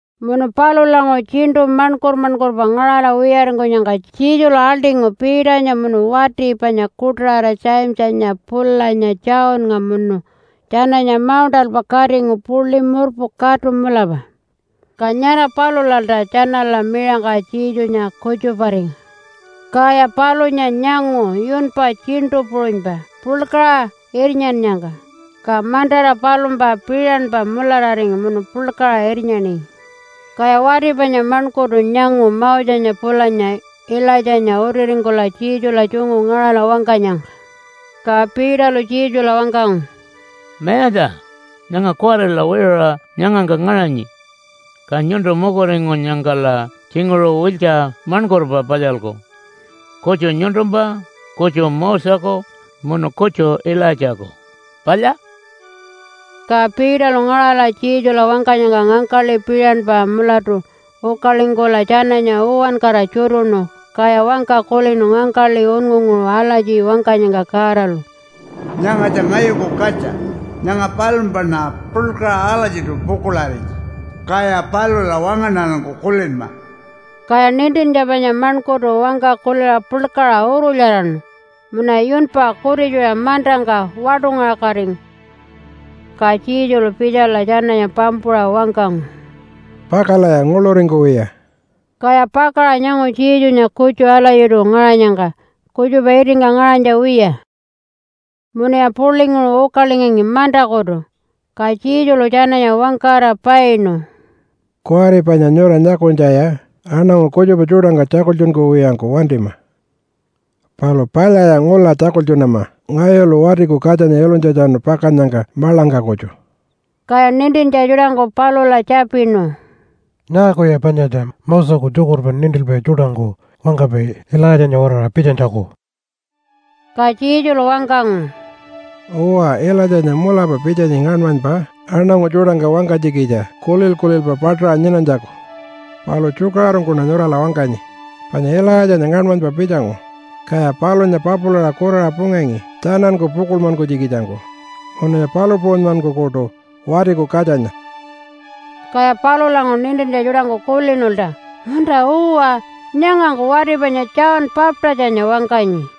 Munu palulanguṟu tjiṉṯu maṉkur-maṉkurpa ngaṟala wiyaringkunyangka Jesulu aḻṯingu Peternya munu wati panya kuṯaṟara Jamesanya pulanya Johnnga munu tjananya mauṉṯalpa katingu puḻi murpu katu mulapa. Ka nyara palulalta tjanala miṟangka Jesunya kutjuparingu. Kaya palunya nyangu yunpa tjiṉṯu puṟunypa puḻkaṟa irnyannyangka, ka mantara palumpa piṟanpa mulararingu munu puḻkaṟa irnyaningi. Kaya wati panya maṉkurtu nyangu Mosenya pulanya Ilaitjanya utiringkula Jesula tjungu ngaṟala wangkanyangka. Ka Peterlu Jesula wangkangu, “Mayatja, nyanga kuwarila wiṟuṟa nyangangka ngaṟanyi. Ka nyuntu mukuringkunyangkala tjinguṟu wiltja maṉkurpa palyalku, kutju nyuntumpa, kutju Moseku, munu kutju Ilaitjaku. Palya?” Ka Peterlu ngaṟala Jesula wangkanyangka ngangkaḻi piṟanpa mulatu ukalingkula tjananya uwankara tjutuṉu, kaya wangka kulinu ngangkaḻi unngunguṟu alatji wangkanyangka Godalu, “Nyangatja ngayuku katja. Nyanga palumpaṉa puḻkaṟa alatjiṯu pukuḻarinyi. Kaya palula wangaṉarangku kulinma!” Kaya nintintja panya maṉkurtu wangka kuliṟa puḻkaṟa urulyaraṉu munuya yunpa kutitjuṟa mantangka waṯungaṟakatingu. Ka Jesulu pitjala tjananya pampuṟa wangkangu, “Pakalaya nguḻuringkuwiya!” Kaya pakaṟa nyangu Jesunya kutju alatjiṯu ngaṟanyangka kutjupa itingka ngaṟanytja wiya. Munuya puḻinguṟu ukalingangi mantakutu, ka Jesulu tjananya wangkara painu, “Kuwari panya nyura nyakunytjaya aṉangu kutjupa tjuṯangka tjakultjunkuwiyangku wantima. Palu palyaya ngula tjakultjunama ngayulu Watiku Katjanya ilunytjatjanu pakannyangka maḻangka kutju.” Kaya nintintja tjuṯangku palula tjapinu, “Nyaakuya panyatja Moseku tjukurpa nintilpai tjuṯangku wangkapai Ilaitjanya-waraṟa pitjanytjaku?” Ka Jesulu wangkangu, “Uwa, Ilaitjanya mulapa pitjanyi ngaṉmanypa aṉangu tjuṯangka wangkanytjikitja kulil-kulilpa paṯaṟa nyinanytjaku. Palu tjukaṟurungkuṉa nyurala wangkanyi, panya Ilaitjanya ngaṉmanypa pitjangu, kaya palunya papulaṟa kuraṟa pungangi tjananku pukuḻmankunytjikitjangku, munuya palu puṟunymankukuṯu Watiku Katjanya.” Kaya palulanguṟu nintintja tjuṯangku kulinulta, “Munta-uwa, nyangangku wati panya John Baptistanya wangkanyi.”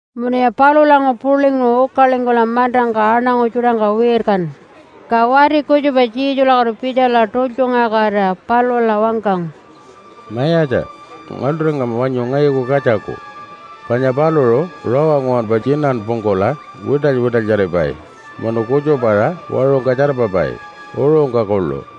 Munuya palulanguṟu puḻinguṟu ukalingkula mantangka aṉangu tjuṯangka wirkanu, ka wati kutjupa Jesulakutu pitjala tultjungaṟakatira palula wangkangu, “Mayatja, ngaḻṯuringama wanyu ngayuku katjaku, panya paluṟu rawa nguwanpa tjinanpungkula wiṯaly-wiṯalyaripai munu kutjupa-aṟa waṟungka tjarpapai uṟungka kuḻu.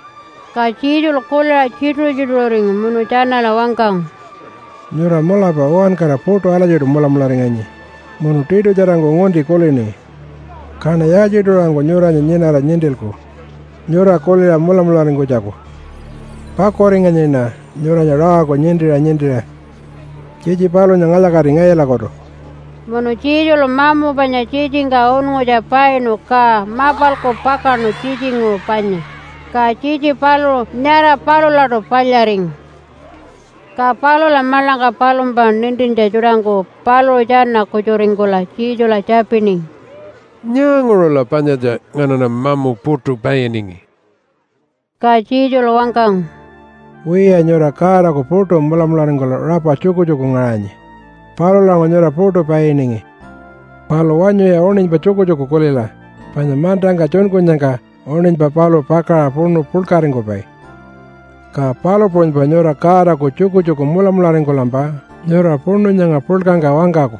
Ka Jesulu kuliṟa tjituṟu-tjituṟuringu munu tjanala wangkangu, “Nyura mulapa uwankara puṯu alatjiṯu mulamularinganyi munu tiṯutjarangku ngunti kulini. Kaṉa yaaltjiṯu-aṟangku nyuranya nyinara nintilku nyura kuliṟa mulamularingkunytjaku? Pakuringanyiṉa nyuranya rawangku nintiṟa nintiṟa. Tjitji palunya ngalya-kati ngayulakutu!” Munu Jesulu mamu panya tjitjingka unngutja painu ka mapalku pakaṉu tjitjinguṟu panya, ka tjitji paluṟu nyara palulaṯu palyaringu. Ka palula maḻangka palumpa nintintja tjuṯangku paluṟu tjana-kutjuringkula Jesula tjapiningi, “Nyaanguṟula panyatja nganaṉa mamu puṯu painingi?” Ka Jesulu wangkangu, “Wiya, nyura Godaku puṯu mulamularingkula rapa tjukutjuku ngaṟanyi. Palulanguṟu nyura puṯu painingi. Palu wanyuya uṉinypa tjukutjuku kulila. Panya mantangka tjunkunyangka uṉinypa paluṟu pakaṟa puṉu puḻkaringkupai, ka palu puṟunypa nyura Godaku tjukutjuku mulamularingkulampa nyura puṉu nyanga puḻkangka wangkaku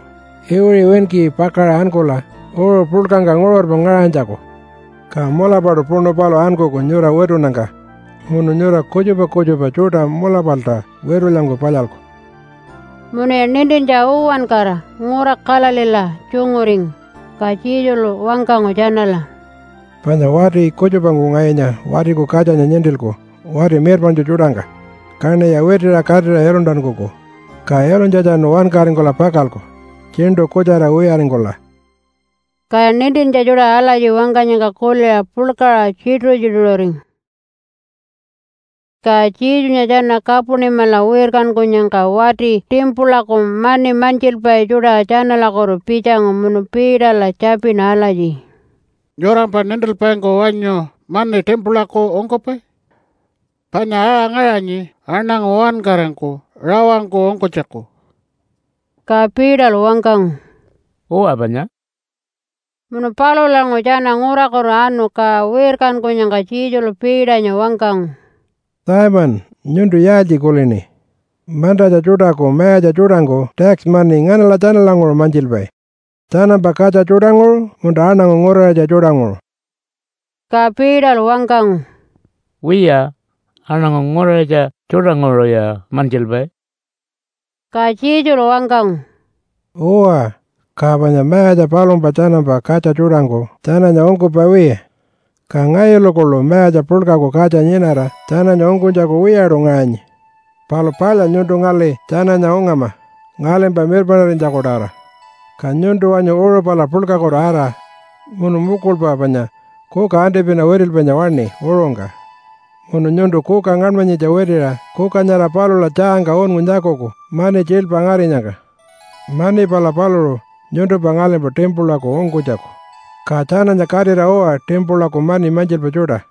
iwiṟi winki pakaṟa ankula uṟu puḻkangka nguṟurpa ngaṟanytjaku. Ka mulapaṯu puṉu paluṟu ankuku nyura witunnyangka, munu nyura kutjupa kutjupa tjuṯa mulapalta witulyangku palyalku.” Munuya nintintja uwankara ngura Galileela tjunguringu, ka Jesulu wangkangu tjanala, “Panya wati kutjupangku ngayunya Watiku Katjanya nintilku wati mirpaṉtju tjuṯangka, kaṉiya witiṟa katira iluntankuku. Ka ilunytjatjanu wankaringkula pakalku tjiṉṯu kutjara wiyaringkula.” Kaya nintintja tjuṯa alatji wangkanyangka kuliṟa puḻkaṟa tjituṟu-tjituṟuringu. Ka Jesunya tjana Kapunimala wirkankunyangka wati timpulaku mani mantjilpai tjuṯa tjanalakutu pitjangu munu Peterla tjapinu alatji, “Nyurampa nintilpaingku wanyu mani timpulaku ungkupai? Panya aṟa ngaṟanyi aṉangu uwankarangku rawangku ungkunytjaku.” Ka Peterlu wangkangu, “Uwa panya!” Munu palulanguṟu tjana ngurakutu anu ka wirkankunyangka Jesulu Peternya wangkangu, “Simon, nyuntu yaaltji kulini? Mantatja tjuṯaku mayatja tjuṯangku tax mani nganala tjanalanguṟu mantjilpai? Tjanampa katja tjuṯanguṟu munta aṉangu nguraṟitja tjuṯanguṟu?” Ka Peterlu wangkangu, “Wiya, aṉangu nguraṟitja tjuṯanguṟuya mantjilpai.” Ka Jesulu wangkangu, “Uwa, ka panya mayatja palumpa tjanampa katja tjuṯangku tjananya ungkupai wiya. Ka ngayulu kuḻu mayatja puḻkaku katja nyinara tjananya ungkunytjaku wiyaṯu ngaṟanyi. Palu palya nyuntu ngali tjananya ungama ngalimpa mirpaṉarinytjaku-tawara. Ka nyuntu wanyu uṟu pala puḻkakutu ara, munu mukulpa panya kuka antipina witilpainya waṉi uṟungka, munu nyuntu kuka ngaṉmanyitja witiṟa kuka nyara palula tjaangka unngu nyakuku mani tjiilpa ngarinyangka. Mani pala paluṟu nyuntumpa ngalimpa timpulaku ungkunytjaku, ka tjananya katira uwa timpulaku mani mantjilpai tjuṯa.”